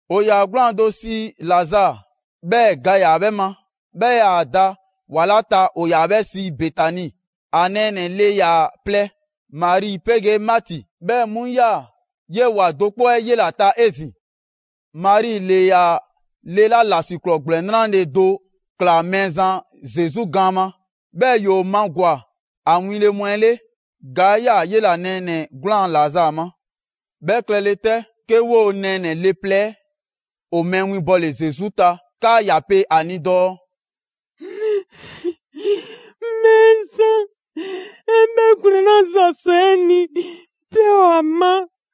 ‑O ‑yaa 'gwlaan‑ do sii Lazaa, 'bhɛɛ‑ ga ‑yaa 'bhɛ ma. 'Bhɛ 'yaa‑ da ‑wa 'la ta ‑o ‑yaa 'bhɛ sii Betani. ‑A nɛɛnɛ‑ ‑le ‑yaa plɛ: Mari 'pegee Maati. 'Bhɛ mu ‑yaa 'yee‑ ‑wa do 'kpɔ 'ɛ 'yela‑ ta 'ezin‑. Mari ‑le ‑yaa le 'la ‑lasiklɔɔ ‑gblɛn 'nrale‑ do ꞊klaa Mɛɛzan Zesu gaan ma, 'bhɛɛ ‑yoo magwa‑ ‑a winle mu 'ɛ 'le. Ga ‑yaa 'yela‑ nɛɛnɛ‑ 'gwlaan‑ Lazaa ma. 'Bhɛ klɛle 'tɛ, 'ke 'woo‑ nɛɛnɛ‑ le plɛ 'ɛ ‑o mɛɛ winbɔle Zesu ta 'kaa ‑ya pe ‑a ni dɔɔ: «Mɛɛzan, 'e 'bhɛgwlɛn‑ 'la ‑za sɔ 'e ni, pɛ ‑o ‑a ma.»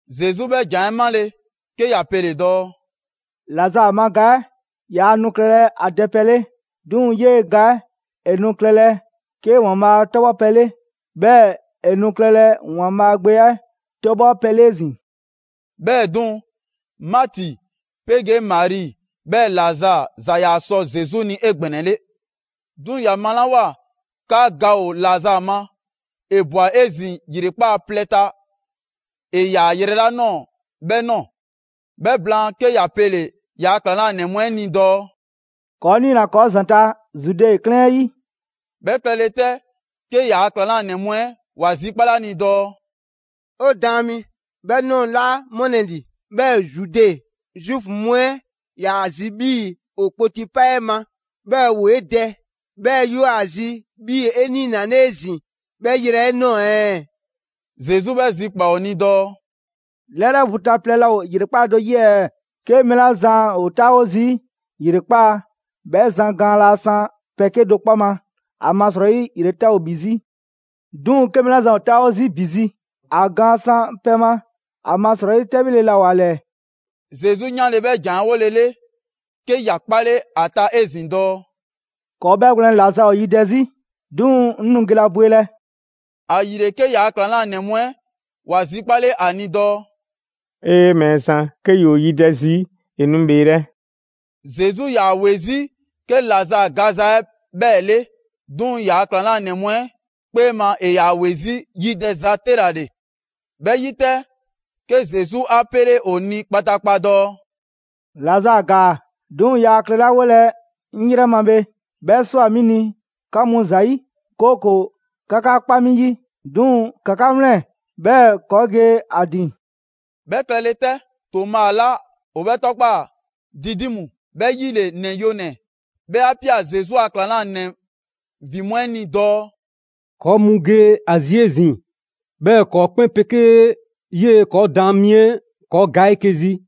Zesu 'bhɛ ‑jan 'ɛ 'male‑, 'ke ‑ya pele‑ dɔɔ: «Lazaa ma ga 'ɛ yaa nu klɛlɛ ‑a dɛpɛ 'le. 'Duŋ‑ 'yee‑ ga 'ɛ ‑e nu klɛlɛ 'ke ‑Waanbhaa' 'tɔbhɔpɛ 'le; 'bhɛɛ‑ ‑e nu klɛlɛ ‑Waanbhaa' Gbe 'ɛ 'tɔbhɔpɛ 'le 'ezin‑.» 'Bhɛɛ‑ 'duŋ‑, Maati 'pegee Mari, 'bhɛɛ‑ Lazaa ‑za ‑yaa sɔ Zesu ni 'egbɛnɛle. 'Duŋ‑ ‑ya malawoa 'kaa ga ‑o Lazaa ma, ‑e ꞊bwa 'ezin‑ ‑yrekpaa' plɛ ta ‑e ‑yaa yrɛ 'la ꞊nɔɔ 'bhɛ ꞊nɔɔ. 'Bhɛ blaan, 'ke ‑ya pele‑ ‑yaa ‑klaŋlanɛ mu 'ɛ ni dɔɔ: «‑Kɔɔ' 'niina‑ ‑kɔɔ' ‑zanta' Zude 'klɛɛn 'ɛ 'yi.» 'Bhɛ klɛle 'tɛ, 'ke ‑yaa' ‑klaŋlanɛ mu 'ɛ ‑wa zikpale ‑a ni dɔɔ: «'O Daan mi, 'bhɛ ꞊nɔɔ laa ‑mɔlɛ' ‑li, 'bhɛɛ‑ Zude Zuufu mu 'ɛ ‑yaa zi 'bhii‑ ‑o kpoti 'pa 'e ma, 'bhɛɛ‑ ‑woo 'e dɛ, 'bhɛɛ‑ 'yoo‑ ‑a zi 'bhii‑ 'e 'niinale 'ezin‑ 'bhɛɛ‑ yrɛ 'ɛ ꞊nɔɔ ɛɛ?» Zesu 'bhɛ zikpaa‑ ‑o ni dɔɔ: «'Lɛrɛ vu ta plɛ laa ‑o ‑yrekpaa' do 'yi ɛɛ? 'Ke mɛɛ 'la zan ‑o 'taawo zii' ‑yrekpaa', 'bhɛ zan gaan laa san pɛ 'kedo‑ 'kpɔ ma, ‑amasrɔyi ‑yretɛ' ‑o ‑bhi 'zi. 'Duŋ‑ 'ke mɛɛ 'la zan 'taawo zii' ‑bi zi, ‑a gaan san pɛ ma; ‑amasrɔyi 'tɛbhile laa ‑o ‑a ‑lɛɛ.» Zesu 'yanle‑ 'bhɛ ‑jan 'ɛ 'wolele, 'ke ‑ya 'kpale 'a ta 'ezin‑ dɔɔ: «‑Kɔɔ' 'bhɛgwlɛn‑ Lazaa ‑o yidɛ zi, 'duŋ‑ 'ŋ nu gelɛ ‑a bwelɛ.» ‑Ayile 'ke ‑yaa' ‑klaŋlanɛ mu 'ɛ ‑wa zikpale ‑a ni dɔɔ: «'Ee! Mɛɛzan, 'ke ‑yoo yidɛ 'zi, ‑e nu ‑bheelɛ'.» Zesu 'yaa‑ ‑we 'zi 'ke Lazaa gaza 'ɛ 'bhɛɛ‑ 'le, 'duŋ‑ ‑yaa' ‑klaŋlanɛ mu 'ɛ 'kpee ma, ‑e ‑yaa ‑we 'zi yidɛza 'te ‑la ‑le. 'Bhɛ 'yi 'tɛ, 'ke Zesu 'a 'pele ‑o ni kpataakpa dɔɔ: «Lazaa ‑gaa. 'Duŋ‑ yaa klɛlawolɛ 'ŋ 'yrɛ ma bhe, 'bhɛ ꞊swa 'mi ni 'ka mu ‑zayi', 'kooko‑ 'ka 'ka kpa 'mi 'yi. 'Duŋ‑ ‑ka 'ka 'wlɛn‑, 'bhɛɛ‑ ‑kɔɔ' ge ‑a ‑din.» 'Bhɛ klɛle 'tɛ, Toma 'la ‑o 'bhɛ 'tɔkpaa‑ Didimu ('bhɛ 'yi ‑le ‹‑Nɛ Yonɛ‑›), 'bhɛ 'a 'pia‑ Zesu a ‑klaŋlanɛ ‑vin mu 'ɛ ni dɔɔ: «‑Kɔɔ' mu ge ‑a zi 'ezin‑, 'bhɛɛ‑ ‑kɔɔ' 'kpɛn 'pegee 'yee‑ ‑kɔɔ' Daan mi 'ɛ ‑kɔɔ' ga 'eke‑ zi!»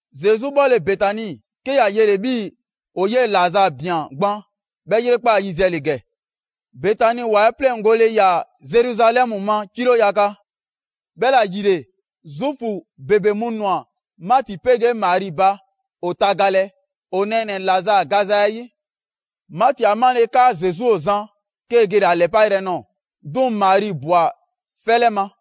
Zesu 'bhɔle‑ Betani, 'ke ‑ya yele‑ 'bhii‑ ‑o 'yee‑ Lazaa ꞊bian gban 'bhɛ ‑yrekpaa' yiziɛ ‑le ‑gɛ. Betani ‑wa 'ɛ 'pleŋgole ‑yaa Zeruzalɛmu ma kilo yaga. 'Bhɛla‑ ‑yile, Zuufu ‑bebe mu ‑nwa Maati 'pegee Mari ba ‑o tagalɛ, ‑o nɛɛnɛ‑ Lazaa gaza 'ɛ 'yi. Maati 'a 'male‑ 'kaa Zesu ‑o zan, 'kee‑ gele‑ ‑a ‑lɛpa' yrɛ nɔɔ‑; 'duŋ‑ Mari ꞊bwa 'fɛ 'lɛ ma.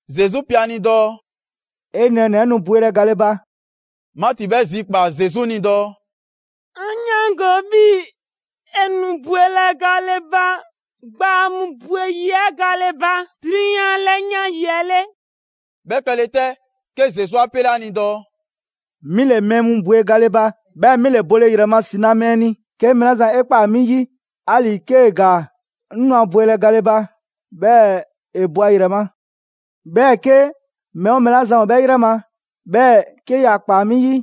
Zesu pe ‑a ni dɔɔ: «'E nɛɛnɛ‑ 'ɛ nu bwelɛ gale ba.» Maati 'bhɛ zikpaa‑ Zesu ni dɔɔ: «'An 'yaango‑ 'bhii‑ ‑e nu bwelɛ gale ba gbaa mu ‑bwe yi 'ɛ gale ba 'drunyan 'lɛyan yi 'ɛ 'le.» 'Bhɛ klɛle 'tɛ, 'ke Zesu 'a 'pele ‑a ni dɔɔ: «'Mi ‑le mɛɛ mu bwe gale ba, 'bhɛɛ‑ 'mi ‑le bole ‑yrɛ ma ‑si na mɛɛ ni. 'Ke mɛɛ 'la zan 'e ꞊kpaa 'mi 'yi, 'ali‑ 'kee‑ ‑gaa, 'ŋ nu ‑a bwelɛ gale ba, 'bhɛɛ‑ ‑e bo ‑a ‑yrɛ ma. 'Bhɛɛ‑ 'ke mɛɛ 'oo mɛɛ 'la zan ‑o ‑a ‑yrɛ ma, 'bhɛɛ‑ 'ke ‑ya ‑kpaa 'mi 'yi,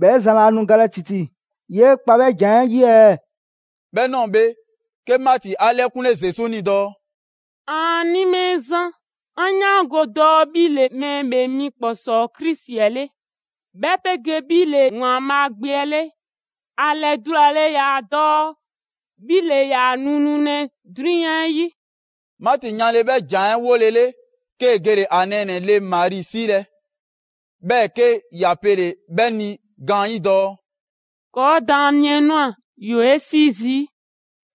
'bhɛ zan laa nu galɛ ‑titi. 'Yee kpa 'bhɛ ‑jan 'ɛ 'yi ɛɛ?» 'Bhɛ ꞊nɔɔ bhe, 'ke Maati 'a 'lɛkunle Zesu ni dɔɔ: «‑Aani' Mɛɛzan, 'an 'yaango‑ dɔɔ 'bhi ‑le Mɛɛ ‑Bhee Mi ‑Kpɔsɔɔ Krisi 'ɛ 'le, 'bhɛ 'pegee 'bhi ‑le ‑Waanbhaa' Gbe 'ɛ 'le; ‑a ‑lɛdulale ‑yaa dɔɔ 'bhi ‑le ‑yaa nu nulɛ 'drunyan 'yi.» Maati 'yanle‑ 'bhɛ ‑jan 'ɛ 'wolele, 'kee‑ gele‑ ‑a nɛɛnɛ‑ le Mari 'siilɛ‑; 'bhɛɛ‑ 'ke ‑ya pele‑ 'bhɛ ni gaanyi' dɔɔ: «‑Kɔɔ' Daan mi 'ɛ ꞊nwa, ‑yoo 'e 'sii zii'.»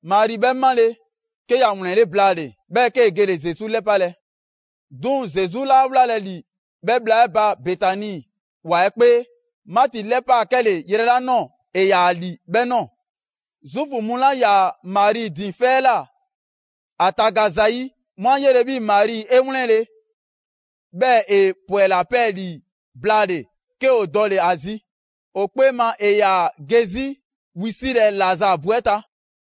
Mari 'bhɛ 'male‑, 'ke ‑ya ‑wlɛnle' blaale‑, 'bhɛɛ‑ 'kee‑ gele‑ Zesu 'lɛpalɛ. 'Duŋ‑ Zesu 'laa wlalɛ ‑li 'bhɛ bhla 'ɛ ba Betani ‑wa 'ɛ 'kpee. Maati 'lɛpaa‑ 'kɛle‑ yrɛ 'la ꞊nɔɔ, ‑e ‑yaa ‑li 'bhɛɛ‑ ꞊nɔɔ. Zuufu mu 'la 'yaa‑ Mari ‑din 'fɛ 'ɛ ꞊la ‑a taga zayi', 'mu 'a 'yele‑ 'bhii‑ Mari 'e 'wlɛnle‑, 'bhɛɛ‑ ‑e ‑pwɛla 'pɛɛlii‑ blaale‑; 'ke ‑o dɔle‑ ‑a zi. ‑O 'kpee ma ‑e ‑yaa ge 'zi wisilɛ Lazaa bu 'ɛ ta.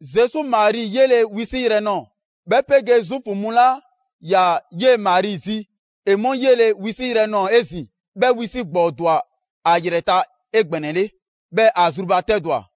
Zesu Mari 'yele‑ wisiyrɛ nɔɔ‑, 'bhɛ 'pegee Zuufu mu 'la 'yaa‑ 'yee‑ Mari zi, ‑e 'mu 'yele‑ wisi' yrɛ nɔɔ‑ 'ezin‑, 'bhɛ wisi' ‑gbɔɔ ‑dwa ‑a ‑yrɛ ta 'egbɛnɛle, 'bhɛɛ‑ ‑a zrubatɛdwa.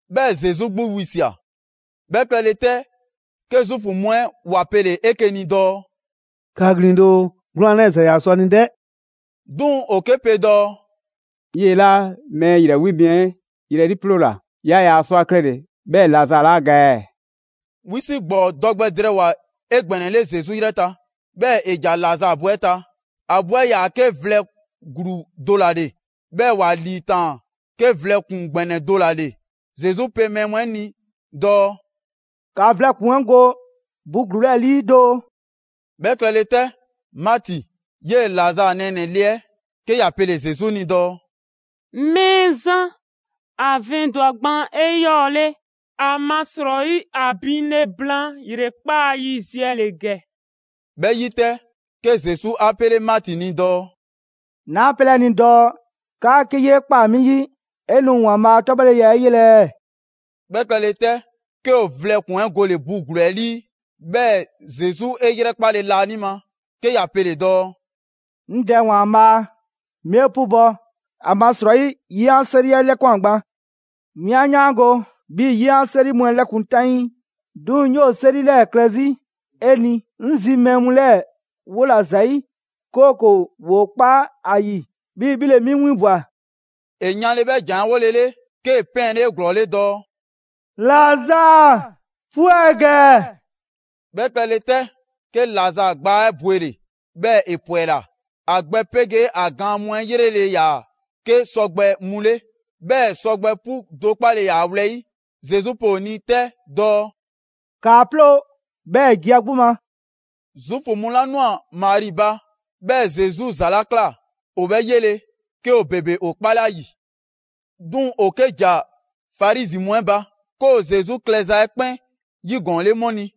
'Bhɛɛ‑ Zesu 'gbu wisia꞊. 'Bhɛ klɛle 'tɛ, 'ke Zuufu mu 'ɛ ‑wa pele‑ 'eke‑ ni dɔɔ: «‑Kaa ‑glin doo! 'Gwlaan‑ 'lɛɛ‑ ‑za ‑yaa sɔ ‑a ni dɛ!» 'Duŋ‑ ‑o 'ke pe dɔɔ: «'Yee‑ 'la mɛɛ ‑yrɛ 'wi mi 'ɛ 'yrɛ 'liiploola, yaa ‑yaa sɔ ‑a klɛle‑ 'bhɛɛ‑ Lazaa 'laa ga ɛɛ?» Wisi' ‑gbɔɔ dɔ gbɛ drɛɛwoa‑ 'egbɛnɛle Zesu 'yrɛ ta, 'bhɛɛ‑ ‑e ‑ja Lazaa bu 'ɛ ta. ‑A bu 'ɛ 'yaa‑ 'ke vlɛ ‑gluu do ‑la ‑le, 'bhɛɛ‑ ‑wa ‑liitaan 'ke vlɛ ‑kpuŋ ‑gbɛnɛ do ‑la ‑le. Zesu pe mɛɛ mu 'ɛ ni dɔɔ: «‑Ka vlɛ ‑kpuŋ 'ɛ go bu ‑gluu 'ɛ 'lii doo!» 'Bhɛ klɛle 'tɛ, Maati, 'yee‑ Lazaa nɛɛnɛ‑ le 'ɛ, 'ke ‑ya 'pele Zesu ni dɔɔ: «Mɛɛzan, ‑a vɛndwa‑ gban 'eyɔɔle, ‑amasrɔyi ‑a binle blaan ‑yrekpaa' yiziɛ ‑le ‑gɛ.» 'Bhɛ 'yi 'tɛ, 'ke Zesu 'a 'pele Maati ni dɔɔ: «'Naa 'pelɛ 'e ni dɔɔ 'kaa 'ke 'yee ꞊kpaa 'mi 'yi, 'e nu ‑Waanbhaa' a 'tɔbhɔleya 'ɛ 'yelɛ ɛɛ?» 'Bhɛ klɛle 'tɛ, 'ke ‑o vlɛ ‑kpuŋ 'ɛ gole‑ bu ‑gluu 'ɛ 'lii. 'Bhɛɛ‑ Zesu 'e 'yrɛkpale laanima, 'ke ‑ya pele‑ dɔɔ: «'Ŋ Dɛ ‑Waanbhaa', 'mi 'e 'pubɔ‑ ‑amasrɔyi 'ye 'an 'seri 'ɛ 'lɛkwan‑ gban. 'Mi 'an 'yaango‑ 'bhii‑ 'ye 'an 'seri mu 'ɛ 'lɛkun‑ 'taŋii, 'duŋ‑ 'ŋ 'yoo‑ 'seri 'lɛɛ‑ klɛ 'zi 'e ni, 'ŋ zi mɛɛ mu 'lɛɛ‑ 'wola‑ ‑zayi'; 'kooko‑ ‑woo kpa ‑a ‑yi 'bhii‑ 'bhi ‑le 'mi 'winbwa‑.» ‑E yanle‑ 'bhɛ ‑jan 'ɛ 'wole‑ 'le, 'kee‑ 'pɛɛnle 'eglɔɔle dɔɔ: «Lazaa 'pwɛ ‑gɛ!» 'Bhɛ klɛle 'tɛ, 'ke Lazaa gbaa 'ɛ bwele‑, 'bhɛɛ‑ ‑e ‑pwɛla. ‑A gbɛ 'pegee ‑a gaan mu 'ɛ 'yrele‑ ‑yaa 'ke sɔgbɛ mu 'le, 'bhɛɛ‑ sɔgbɛ 'pu do 'kpale‑ ‑yaa ‑a wlɛyi'. Zesu pe ‑o ni 'tɛ dɔɔ: «‑Kaa 'ploo‑, 'bhɛɛ‑ ‑e ge a 'gbu ma!» Zuufu mu 'la ꞊nwa Mari ba, 'bhɛɛ‑ Zesu ‑za 'la ꞊kla, ‑o 'bhɛ 'yele‑, 'ke ‑o ‑bebe ‑o 'kpale 'a ‑yi. 'Duŋ‑ ‑o 'ke ‑ja Farizi mu 'ɛ ba, 'ke ‑o Zesu klɛza 'ɛ 'kpɛn 'yigɔɔnle 'mu ni.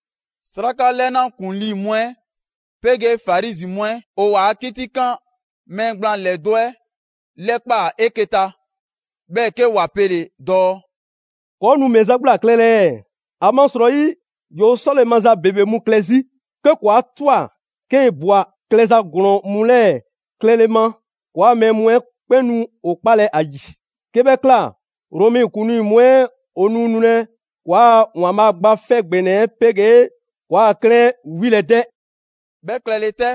'Sraka 'lɛna ‑kuŋlii mu 'ɛ 'pegee Farizi mu 'ɛ ‑o ‑waa 'kitikan mɛɛ gblaan ‑lɛdo' 'ɛ 'lɛkpaa‑ 'eke‑ ta, 'bhɛɛ‑ 'ke ‑wa pele‑ dɔɔ: «‑Kɔɔ' nu ‑mɛ za 'gbu ‑la klɛlɛ ɛɛ? ‑Amasrɔyi ‑yoo 'sɔle‑ maza ‑bebe mu klɛ 'zi. 'Ke ‑kɔɔ' 'a 'twa‑ 'kee ꞊bwa klɛza ‑glɔɔn mu 'lɛɛ‑ klɛle ma, ‑kɔɔa' mɛɛ mu 'ɛ 'kpɛn nu ‑o 'kpalɛ ‑a ‑yi. 'Ke 'bhɛ ꞊kla, Romɛ ‑kuŋlii mu 'ɛ ‑o nu nulɛ ‑kɔɔa' ‑Waanbhaa' Gba 'Fɛ ‑Gbɛnɛ 'ɛ 'pegee ‑kɔɔa' 'klɛɛn 'ɛ 'wilɛ‑ 'dɛ!» 'Bhɛ klɛle 'tɛ,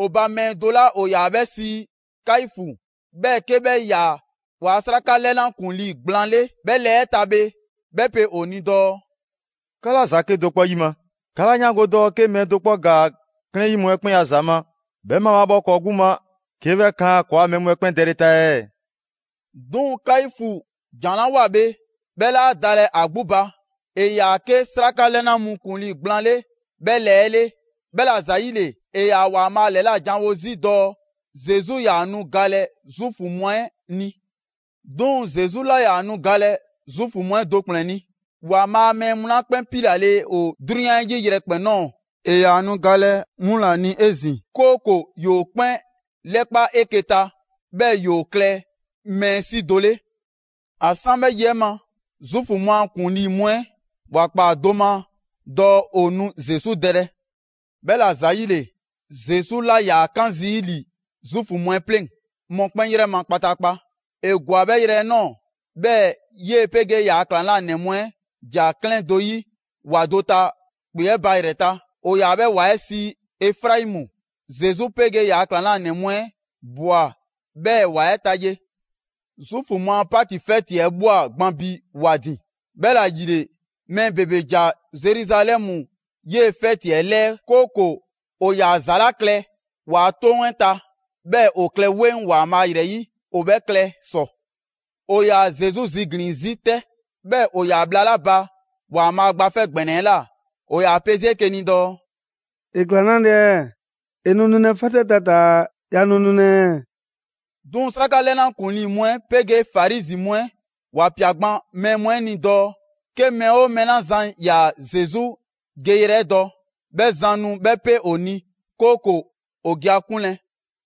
‑o ba mɛɛ do 'la ‑o ‑yaa 'bhɛ sii Kaifu, 'bhɛɛ‑ 'ke 'bhɛ 'yaa‑ ‑waa' 'sraka 'lɛna ‑kuŋlii gblaan 'le 'bhɛ lɛɛ 'ɛ ta bhe, 'bhɛ pe ‑o ni dɔɔ: «'Ka 'laa ‑za 'kedo‑ 'kpɔ 'yima‑! 'Kaa 'laa 'yaango‑ dɔɔ 'ke mɛɛ do 'kpɔ ‑gaa 'klɛɛn 'yi mu 'ɛ 'kpɛn a ‑za ma, 'bhɛ mabhaabhɔ ‑kɔɔ' 'gbu ma 'ke 'bhɛ kan ‑kɔɔa' mɛɛ mu 'ɛ 'kpɛn dɛle ta ɛɛ?» 'Duŋ‑ Kaifu ‑jan 'la 'woa‑ bhe, 'bhɛ 'laa dalɛ ‑a 'gbu ba; ‑e ‑yaa 'ke 'sraka 'lɛna mu ‑kuŋlii gblaan 'le 'bhɛ lɛɛ 'ɛ 'le, 'bhɛla‑ ‑zayile ‑e ‑yaa ‑Waanbhaa' ‑lɛla' janwo 'zi dɔɔ Zesu 'yaa‑ nu galɛ Zuufu mu 'ɛ ni. 'Duŋ‑ Zesu 'laa ‑yaa nu galɛ Zuufu mu 'ɛ do ‑kplɛn ni. ‑Waanbhaa' a mɛɛ mu 'la 'kpɛn 'piilale ‑o 'drunyan 'yi yrɛkpɛn‑ ꞊nɔɔ, ‑e 'yaa‑ nu galɛ 'mu ‑la ni 'ezin‑; 'kooko‑ ‑yoo 'kpɛn 'lɛkpa‑ 'eke‑ ta, 'bhɛɛ‑ ‑yoo klɛ mɛɛ 'si do 'le. ‑A 'san 'bhɛ yi 'ɛ ma, Zuufu mu a ‑kuŋlii mu 'ɛ ‑waa ‑kpaa do ma dɔɔ ‑o nu Zesu dɛlɛ. 'Bhɛla‑ ‑zayile, Zesu 'laa ‑yaa 'kaan zii' ‑li Zuufu mu 'ɛ 'pleŋ‑ mɔkpɛn' 'yrɛ ma kpataakpa. ‑E ‑gwa 'bhɛ yrɛ 'ɛ ꞊nɔɔ, 'bhɛɛ‑ 'yee‑ 'pegee ‑yaa' ‑klaŋlanɛ mu 'ɛ ‑ja 'klɛɛn do 'yi ‑wa do ta ‑kpe 'ɛ ba ‑yrɛ ta. ‑O ‑yaa' 'bhɛ ‑wa 'ɛ sii Efraimu. Zesu 'pegee ‑yaa' ‑klaŋlanɛ mu 'ɛ ꞊bwa 'bhɛɛ‑ ‑wa 'ɛ ta ye. Zuufu mu a Paki 'fɛti 'ɛ ꞊bhwa gban bi ‑wa ‑din. 'Bhɛla‑ ‑yile, mɛɛ ‑bebe ‑ja Zeruzalɛmu 'yee‑ 'fɛti 'ɛ 'lɛɛ, 'kooko‑ ‑o ‑yaa ‑za 'la klɛ ‑waa' 'toŋ 'ɛ ta, 'bhɛɛ‑ ‑o klɛ 'weŋ ‑Waanbhaa' ‑yrɛ 'yi, ‑o 'bhɛ klɛ ‑sɔ. ‑O 'yaa‑ Zesu ziglin‑ 'zi 'tɛ. 'Bhɛɛ‑ ‑o ‑yaa bhla 'la ba ‑Waanbhaa' Gba 'Fɛ ‑Gbɛnɛ 'ɛ ꞊la, ‑o ‑yaa pe 'zi 'eke‑ ni dɔɔ: «‑E ꞊kla 'nale‑ ɛɛ? ‑E nu nulɛ 'fɛti 'ɛ ta taa‑ yaa nu nulɛ ɛɛ?» 'Duŋ‑ 'sraka 'lɛna ‑kuŋlii mu 'ɛ 'pegee Farizi mu 'ɛ ‑wa ‑pia gban mɛɛ mu 'ɛ ni dɔɔ 'ke mɛɛ 'oo mɛɛ 'la zan ‑yaa Zesu geyrɛ 'ɛ dɔ, 'bhɛ zan nu 'bhɛ 'pe ‑o ni, 'kooko‑ ‑o ge ‑a 'kunlɛ‑.